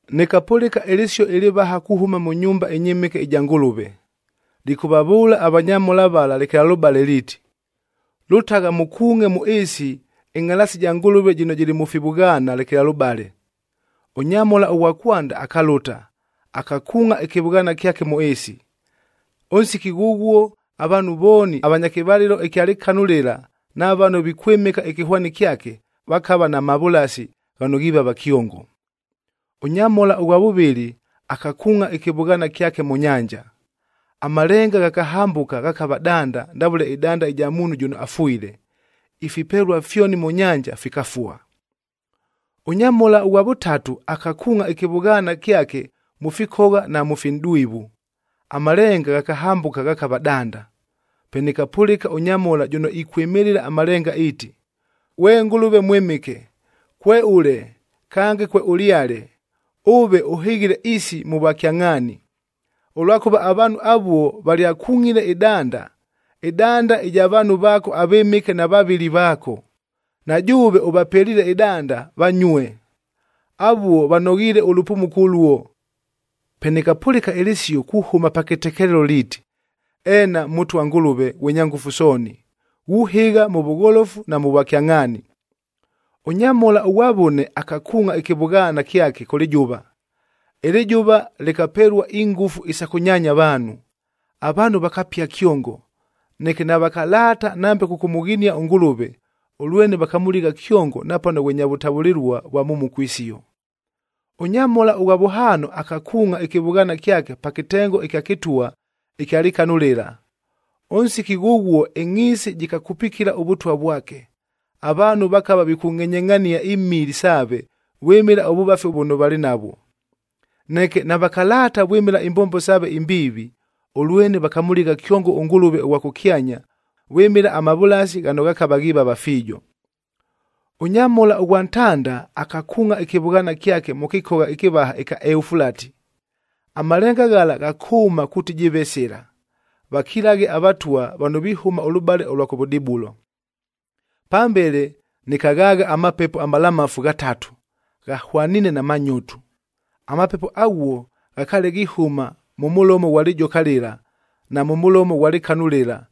Nɨkapʉlɨka ɨlɨsio ɨlɨvaha kuhʉma mʉ nyumba ɨnyɨmɨke ɨja Ngʉlʉve, lɨkʉvavʉʉla avanyamhola vala lekelalʉbale liiti, “Lʉtagha mʉkuungʼe mʉ ɨɨsi ɨngʼhalaasi ja Ngʉlʉve jɨno jɨlɨ mʉ fivʉghaana lekelalʉbale.” Ʉnyamhola ʉghwa kwanda akalʉta, akakuungʼa ɨkɨvʉghaana kyake mʉ ɨɨsi. Ʉnsiki ghʉghuo avaanhu vooni avanya kɨvalɨlo ɨkya lɨkanu lɨla na vano vikwɨmɨka ɨkɨhwani kyake, vakava na mavʉlasi ghano ghivava kyongo. Ʉnyamhola ʉghwa vʉvɨlɨ akakuungʼa ɨkɨvʉghaana kyake mʉ nyanja. Amalenga ghakahambʉka ghakava danda ndavʉle ɨdanda ɨja muunhu jʉno afwile. Ifipelua fyoni mʉ nyanja fikafua. Ʉnyamhola ʉghwa vʉtatu akakuungʼa ɨkɨvʉghaana kyake mʉ fikogha na mʉ finʼdwivu, amalenga ghakahambʉka ghakava danda. Pe nɨkapʉlɨka ʉnyamhola jʉno ikwɨmɨlɨla amalenga iiti, “Ghwe Ngʉlʉve Mwɨmɨke, kweʉle kange kweʉlyale, ʉve ʉhɨghile isi mʉ vwakyangʼhaani. Ʉlwakʉva avaanhu avuo valyakungʼile ɨdanda, ɨdanda ɨja vaanhu vaako avɨmɨke na vavɨli vaako, na jʉʉve ʉvapeliile ɨdanda, vanyue. Avuo vanoghiile ʉlʉpumuko ʉluo!” Pe nɨkapʉlɨka ɨlɨsio kuhʉma pa kɨtekelelo liiti, “Eena Mʉtwa Ngʉlʉve ghwe Nyangʉfu Sooni, ghuhɨgha mʉ vʉgholofu na mʉ vwakyangʼhaani.” Ʉnyamhola ʉghwa vʉne akakuungʼa ɨkɨvʉghaana kyake kʉ lɨjʉva. Ɨlɨjʉva lɨkapelua ingʉfu isa kʉnyaanya avaanhu. Avaanhu vakapia kyongo. Neke navakalaata nambe kʉkʉmʉghinia ʉNgʉlʉve, ʉlwene vakamʉligha kyongo napano ghwe nya vʉtavʉlɨlua vwa mhumuko isio. Ʉnyamhola ʉghwa vʉhaano akakuungʼa ɨkɨvʉghaana kyake pa kɨtengo ɨkya kɨtwa ɨkya lɨkanu lɨla. Ʉnsiki ghʉghuo ɨngʼhiisi jɨkakupikila ʉvʉtwa vwake. Avaanhu vakava vikungʼenyengʼhania imili saave vwɨmɨla ʉvʉvafi vʉno valɨ navwo. Neke navakalaata vwɨmɨla imbombo saave imbiivi, ʉlwene vakamʉligha kyongo ʉNgʉlʉve ʉghwa kʉkyanya vwɨmɨla amavʉlasi ghano ghakava ghivava fiijo. Ʉnyamhola ʉghwa ntanda akakuungʼa ɨkɨvʉghaana kyake mʉ kɨkogha ɨkɨvaha ɨkya Eufulati. Amalenga ghala ghakʉʉma kuuti jɨɨve sɨla, vakilaghe avatwa vano vihʉma ʉlʉbale ʉlwa kʉvʉdibulo. Pambele nɨkaghaagha amapepo amalamafu ghatatu, ghahwaniine na manyotu. Amapepo aghuo ghakaale ghihʉma mʉ mʉlomo ghwa lɨjoka lɨla, na mʉ mʉlomo ghwa lɨkanu lɨla,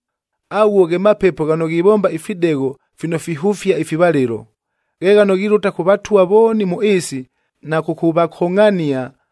Aghuo ghe mapepo ghano ghivomba ifidegho fino fihʉfia ifivalɨlo. Ghe ghano ghilʉta kʉ vatwa vooni mʉ ɨɨsi na kʉkʉvakongʼhania,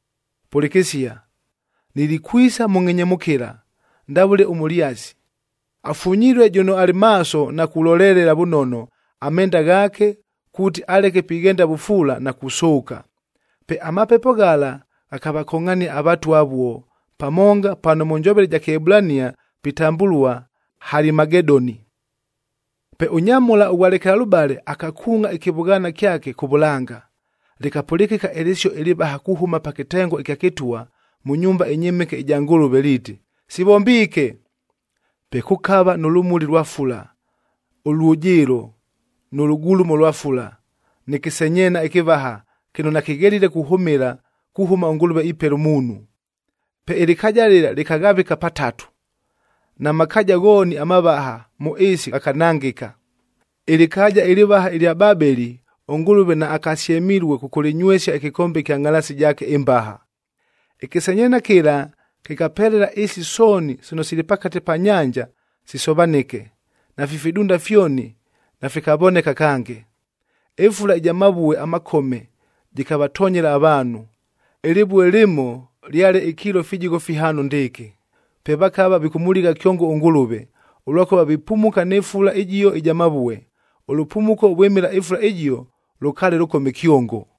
“Pʉlɨkɨsia! Nilikwisa mʉ ngʼhenyemʉkɨla ndavʉle ʉmʉlyasi. Afunyilue jʉno alɨ maaso na kulolelela vʉnono amenda ghaake kuuti aleke pighenda vʉfuula na kusʉʉka.” Pe amapepo ghala ghakavakongʼhania avatwa avuo pamonga pano mʉ njovele ɨja Kɨebulania pitambʉlua Halimagedoni. Pe ʉnyamhola ʉghwa lekelalʉbale akakuungʼa ɨkɨvʉghaana kyake kʉ vʉlanga. Lɨkapʉlɨkɨka ɨlɨsio ɨlɨvaha kuhʉma pa kɨtengo ɨkya kɨtwa mʉ nyumba ɨnyɨmɨke ɨja Ngʉlʉve liiti, “Sivombiike!” Pe kʉkava nʉ lʉmuli lwa fula, ʉlwʉjɨɨlo, nʉ lʉgulumo lwa fula, nɨ kɨsenyeena ɨkɨvaha kɨno nakɨghelile kuhʉmɨla kuhʉma ʉNgʉlʉve ipela ʉmuunhu. Pe ɨlɨkaaja lɨla lɨkaghavɨka pa tatu. Na makaaja ghooni amavaha mʉ ɨɨsi ghakanangɨka. Ɨlɨkaaja ɨlɨvaha ɨlya Babeli ʉNgʉlʉve naakasyemilue kʉkʉlɨnywesia ɨkɨkombe ɨkya ngʼhalaasi jaake ɨmbaha. Ɨkɨsenyeena kɨla kɨkapelela ɨɨsi sooni sino sili pakate pa nyanja sisovanɨke, nafi fidunda fyoni nafikavoneka kange. Ɨfula ɨja mavue amakome jɨkavatonyela avaanhu. Ɨlɨvue lɨmo lyale ikiilo fijigho fihaano ndɨɨkɨ. Pe vakava vikʉmʉligha kyongo ʉNgʉlʉve, ʉlwakʉva vipumuka nɨ fula ɨjio ɨja mavue. Ʉlʉpumuko vwɨmɨla ɨfula ɨjio lʉkaale lʉkome kyongo.